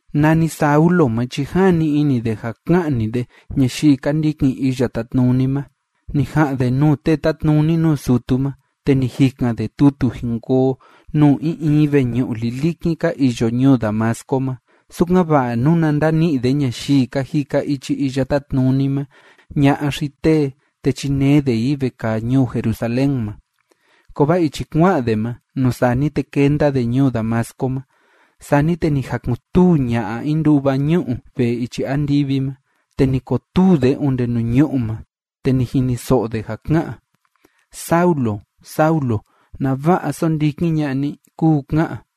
Nani Saulo ma chi jani ini de ja ka'ni de ñayii ka ndikin Iya Tátnuni ma, ni ja'an de nuu tee tátnuni nuu sutu ma, te ni jikan de tutu jin koo nuu in in veñu'u lilikin ka iyo ñuu Damasco ma, sukan‑va'a nuna ndani'i de ñayii ka jika ichi Iya Tátnuni ma, ña'a xi tee, te chinee de i vekaa ñuu Jerusalén ma. Kovaa ichi kua'an de ma, nuu sani te kenda de ñuu Damasco ma, sani te ni jakun‑tuu ña'a in nduva ñu'u vee ichi andivi ma. Te ni kotuu de onde nuu ñu'ú ma, te ni jiniso'o de ja ká'an: ―Saulo, Saulo, ¿nava'a sóndikin ña'a ni? ―kúu ká'an.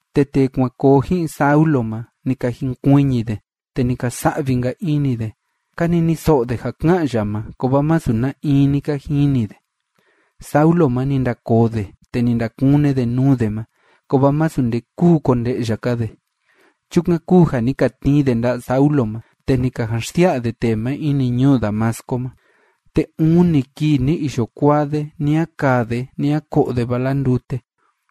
Te tee kuan koo ji'in Saulo ma, ni ka jinkuiñi de, te ni ka sa'vi‑nka ini de. Ka niniso'o de ja ká'an ya ma, kovaa masu na in ni ka jini de. Saulo ma, ni ndakoo de, te ni ndakune de nuu de ma. Kovaa masu nde kúu konde'ya‑ka de. Chukan kúu ja ni ka tnii de nda'a Saulo ma, te ni ka jan xsia'a de tee ma ini ñuu Damasco ma. Te uni kii ni iyo kuaa de, ni a kaa de ni a ko'o de vala ndute.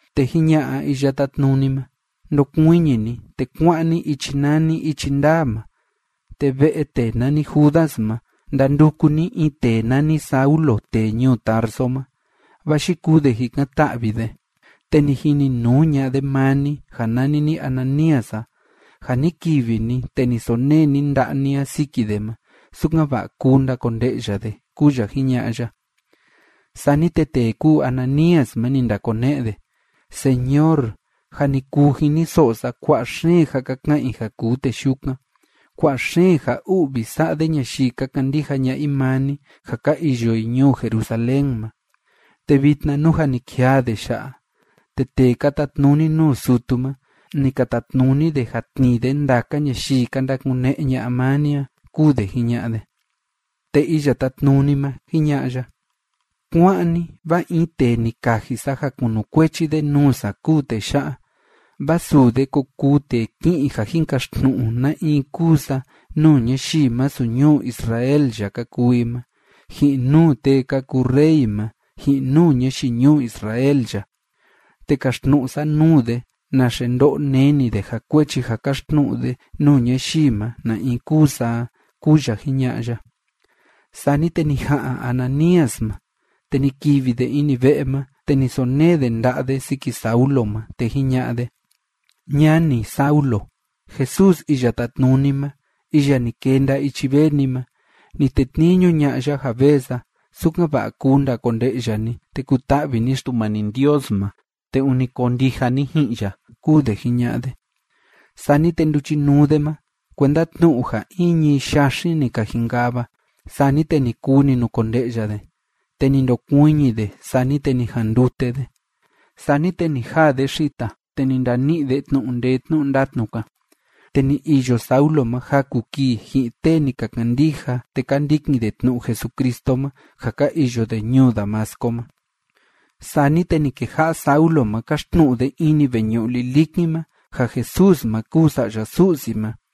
Te jiña'a Iya Tátnuni ma: ―Ndokuiñi ni, te kuá'an ni ichi nani “Ichi Ndaa” ma, te ve'e tee nani Judas ma ndanduku ni in tee nani Saulo tee ñuu Tarso ma. Vaa yikuu de jikan‑ta'vi de, te ni jininuu ña'a de maa ni ja nani ni Ananías a, ja ni kivi ni te ni sonee ni nda'a ni a siki de ma, sukan‑va'a kuu ndakonde'ya de ―kúu ya jiña'a ya. Sani te tee kúu Ananías ma, ni ndakone'e de: ―Señor, jâ ni kuu jiniso'o sa kua'a xeen ja ka ka'an i ja kuu tee yukan. Kua'a xeen ja u'vi sa'a de ñayii ka kandija ña'a i maa ni ja ka iyo i ñuu Jerusalén ma. Te vitna, nú jâ ni kijaa de ya'a, te tee ka tatnuni nuu sutu ma, ni ka tatnuni de ja tnii de ndaka ñayii ka ndakune'e ña'a maa ni a ―kúu de jiña'a de. Te Iya Tátnuni ma, jiña'a ya: ―Kuá'an ni, vaa in tee ni kaji sa ja kunukuechi de nuu sa kúu tee ya'a, vaa suu de ko kuu tee ki'in ja jin kaxtnu'u na in kúu sa nuu ñayii masu ñuu Israel ya ka kuu i ma, ji'in nuu tee ka kuu rey ma, ji'in nuu ñayii ñuu Israel ya. Te kaxtnu'u sa nuu de naxe ndo'o neni de ja kuechi ja kaxtnu'u de nuu ñayii ma na in kúu sa a ―kúu ya jiña'a ya. Sani te ni ja'an Ananías ma, te ni kivi de ini ve'e ma, te ni sonee de nda'a de siki Saulo ma, te jiña'a de: ―Ñani, Saulo, Jesús Iya Tátnuni ma, iya ni kenda ichi vee ni ma, ni tetniñu ña'a ya ja vee sa, sukan‑va'a kuu ndakonde'ya ni, te kuta'vi ni Xtumani Ndios ma te ûni koo ndija ni ji'in ya ―kúu de jiña'a de. Sani te nduchinuu de ma kuenda tnu'u ja in ñií yaxin ni ka jinkava, sani te ni kuu ni nukonde'ya de. Te ni ndokuiñi de, sani te ni jandute de. Sani te ni jaa de xita, te ni ndani'i de tnu'u ndee tnu'u ndatnu‑ka. Te ni iyo Saulo ma jaku kii ji'in tee ni ka kandija te ka ndikin de tnu'u Jesucristo ma ja ka iyo de ñuu Damasco ma. Sani te ni keja'a Saulo ma káxtnu'u de ini veñu'u lilikin ma, ja Jesús ma kúu Sa'ya Su'si ma.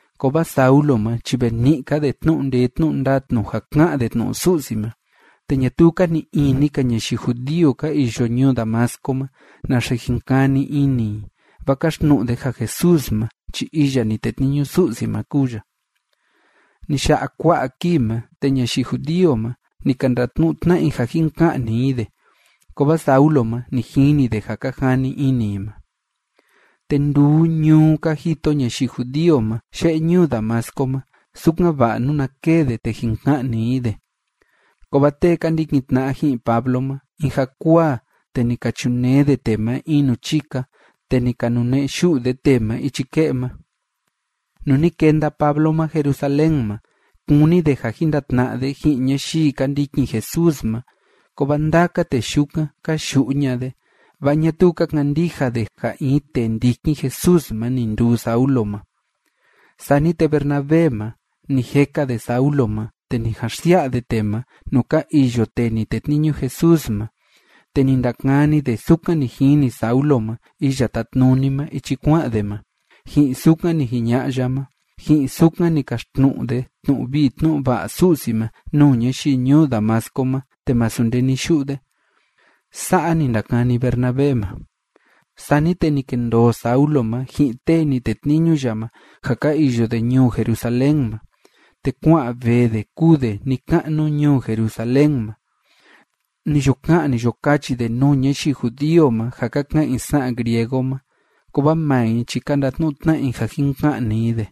Kovaa Saulo ma chi ve ni'i‑ka de tnu'u ndee tnu'u ndatnu ja ká'an de tnu'u Su'si ma, te ñatuu ka ni'i ini‑ka ñayii judío ka iyo ñuu Damasco ma naxe jin kani ini i, vaa káxtnu'u de ja Jesús ma chi iya ni tetniñu Su'si ma kúu ya. Ni ya'a kua'a kii ma, te ñayii judío ma, ni ka ndatnu'u tna'a i ja jin ka'ni i de. Kovaa Saulo ma, ni jini de ja ka jani ini i ma. Te nduu ñuu ka jito ñayii judío ma ye'e ñuu Damasco ma, sukan‑va'a nuna kee de, te jin ka'ni i de. Kovaa tee ka ndikin tna'a ji'in Pablo ma, in jakuaa te ni ka chunee de tee ma in nuu chika, te ni ka nune'e yu'u de tee ma ichi ke'e ma. Nuu ni kenda Pablo ma Jerusalén ma, kúni de ja jin ndatna'a de ji'in ñayii ka ndikin Jesús ma. Kovaa ndaka tee yukan, ka yu'u ña'a de, vaa ñatuu ka kandija de ja in tee ndikin Jesús ma ni nduu Saulo ma. Sani te Bernabé ma, ni jeka de Saulo ma, te ni jan xsia'a de tee ma nuu ka iyo tee ni tetniñu Jesús ma, te ni ndakani de sukan ni jini Saulo ma Iya Tátnuni ma ichi kua'an de ma, ji'in sukan ni jiña'a ya ma, ji'in sukan ni kaxtnu'u de tnu'u vii tnu'u va'a Su'si ma nuu ñayii ñuu Damasco ma te masu nde ni yu'u de. Sa'a ni ndakani Bernabé ma. Sani te ni kendoo Saulo ma ji'in tee ni tetniñu ya ma ja ka iyo de ñuu Jerusalén ma, te kua'an vee de kúu de ni‑ka'nu ñuu Jerusalén ma. Ni yo ka'an, ni yo kachi de nuu ñayii judío ma ja ka ka'an i sa'an griego ma, kovaa maa i chi ka ndatnu'u tna'a i ja jin ka'ni i de.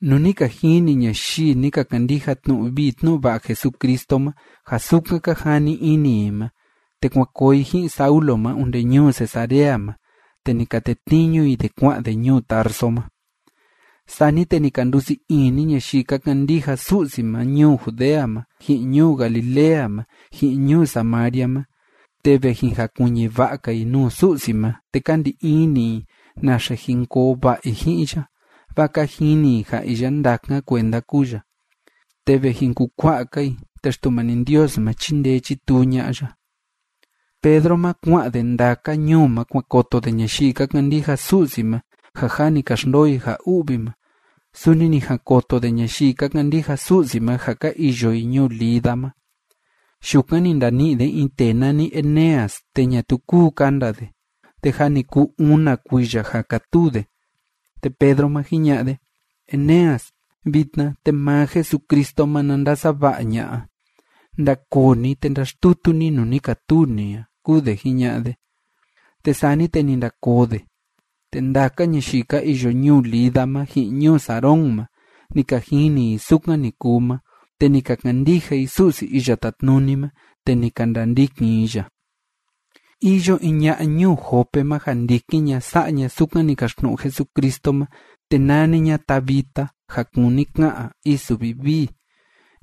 Nuu ni ka jini ñayii ni ka kandija tnu'u vii tnu'u va'a Jesucristo ma ja sukan ka jani ini i ma, te kuan koo i ji'in Saulo ma onde ñuu Cesarea ma, te ni ka tetniñu i de kua'an de ñuu Tarso ma. Sani te ni ka ndusii ini ñayii ka kandija Su'si ma ñuu Judea ma, ji'in ñuu Galilea ma, ji'in ñuu Samaria ma, te ve jin jakuiñi va'a‑ka i nuu Su'si ma, te ka ndi ini i naxe jin koo va'a i ji'in ya, vaa ka jini i ja iya ndákan kuenda kúu ya, te ve jin kukua'a‑ka i, te Xtumani Ndios ma, chíndee chítuu ña'a ya. Pedro ma, kua'an de ndaka ñuu ma kuan koto de ñayii ka kandija Su'si ma ja jâ ni ka xndoo i ja u'vi ma. Suni ni jan koto de ñayii ka kandija Su'si ma ja ka iyo i ñuu Lida ma. Yukan ni ndani'i de in tee nani Eneas, te ñatuu kúu kanda de, te jâ ni kuu una kuiya ja kátuu de. Te Pedro ma, jiña'a de: ―Eneas, vitna te maa Jesucristo ma na ndasava'a ña'a. Ndakoo ni, te ndaxtutu ni nuu ni katuu ni a ―kúu de jiña'a de. Te sani te ni ndakoo de. Te ndaka ñayii ka iyo ñuu Lida ma, ji'in ñuu Sarón ma, ni ka jini i sukan ni kuu ma, te ni ka kandija i Su'si Iya Tátnuni ma, te ni ka ndandikin i ya. Iyo in ña'a ñuu Jope ma ja ndikin ña sa'a ña sukan ni kaxtnu'u Jesucristo ma, te nani ña Tabita, ja kúni ka'an “Isu Vivii”.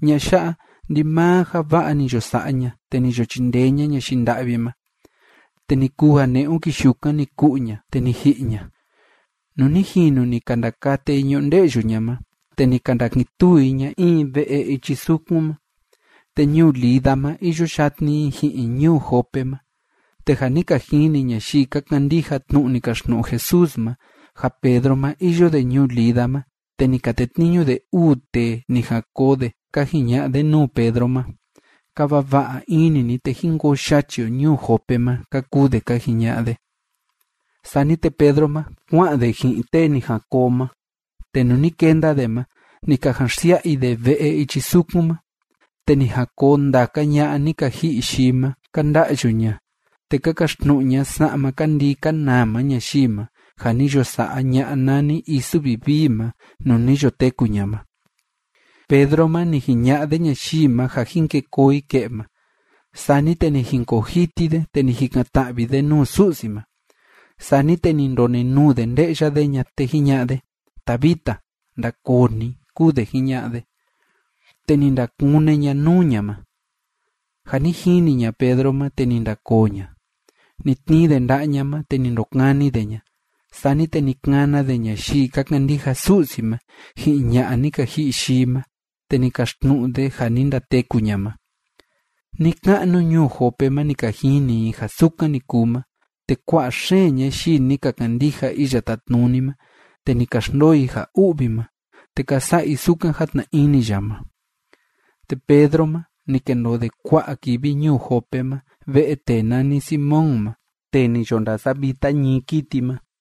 Ña'a ya'a, ndimaa ja va'a ni yo sa'a ña, te ni yo chindee ña ñayii nda'vi ma. Te ni kuu ja ne'un kii yukan ni ku'u ña, te ni ji'i ña. Nuu ni jinu ni ka ndakate i ñunde'yu ña ma, te ni ka ndakin tuu i ña in ve'e ichi sukun ma. Te ñuu Lida ma iyo yatni i ji'in ñuu Jope ma, te ja ni ka jini ñayii ka kandija tnu'u ni kaxtnu'u Jesús ma, ja Pedro ma, iyo de ñuu Lida ma, te ni ka tetniñu de uu tee ni jan koo de ka jiña'a de nuu Pedro ma: ―Kava va'a ini ni, te jin koo yachi o ñuu Jope ma ―ka kuu de ka jiña'a de. Sani te Pedro ma, kua'an de ji'in tee ni jan koo ma. Te nuu ni kenda de ma, ni ka jan xsia'a i de ve'e ichi sukun ma, te ni jan koo ndaka ña'a ni ka ji'i yii ma, ka nda'yu ña, te ka kaxtnu'u ña sa'ma ka ndii ka nama ñayii ma ja ni yo sa'a ña'a nani Isu Vivii ma nuu ni yo teku ña ma. Pedro ma, ni jiña'a de ñayii ma ja jin ke koo i ke'e ma. Sani te ni jinkoo jiti de, te ni jikan‑ta'vi de nuu Su'si ma. Sani te ni ndonenuu de nde'ya de ña, te jiña'a de: ―Tabita, ndakoo ni ―kúu de jiña'a de. Te ni ndakune ña nuu ña ma. Ja ni jini ña Pedro ma, te ni ndakoo ña. Ni tnii de nda'a ña ma, te ni ndokani de ña. Sani te ni kana de ñayii ka kandija Su'si ma ji'in ña'a ni ka ji'i yii ma, te ni kaxtnu'u de ja ni ndateku ña ma. Ni‑ka'nu ñuu Jope ma ni ka jini i ja sukan ni kuu ma, te kua'a xeen ñayii ni ka kandija Iya Tátnuni ma te ni ka xndoo i ja u'vi ma, te ka sa'a i sukan játna ini ya ma. Te Pedro ma, ni kendoo de kua'a kivi ñuu Jope ma ve'e tee nani Simón ma tee ni yo ndasavita ñií kiti ma.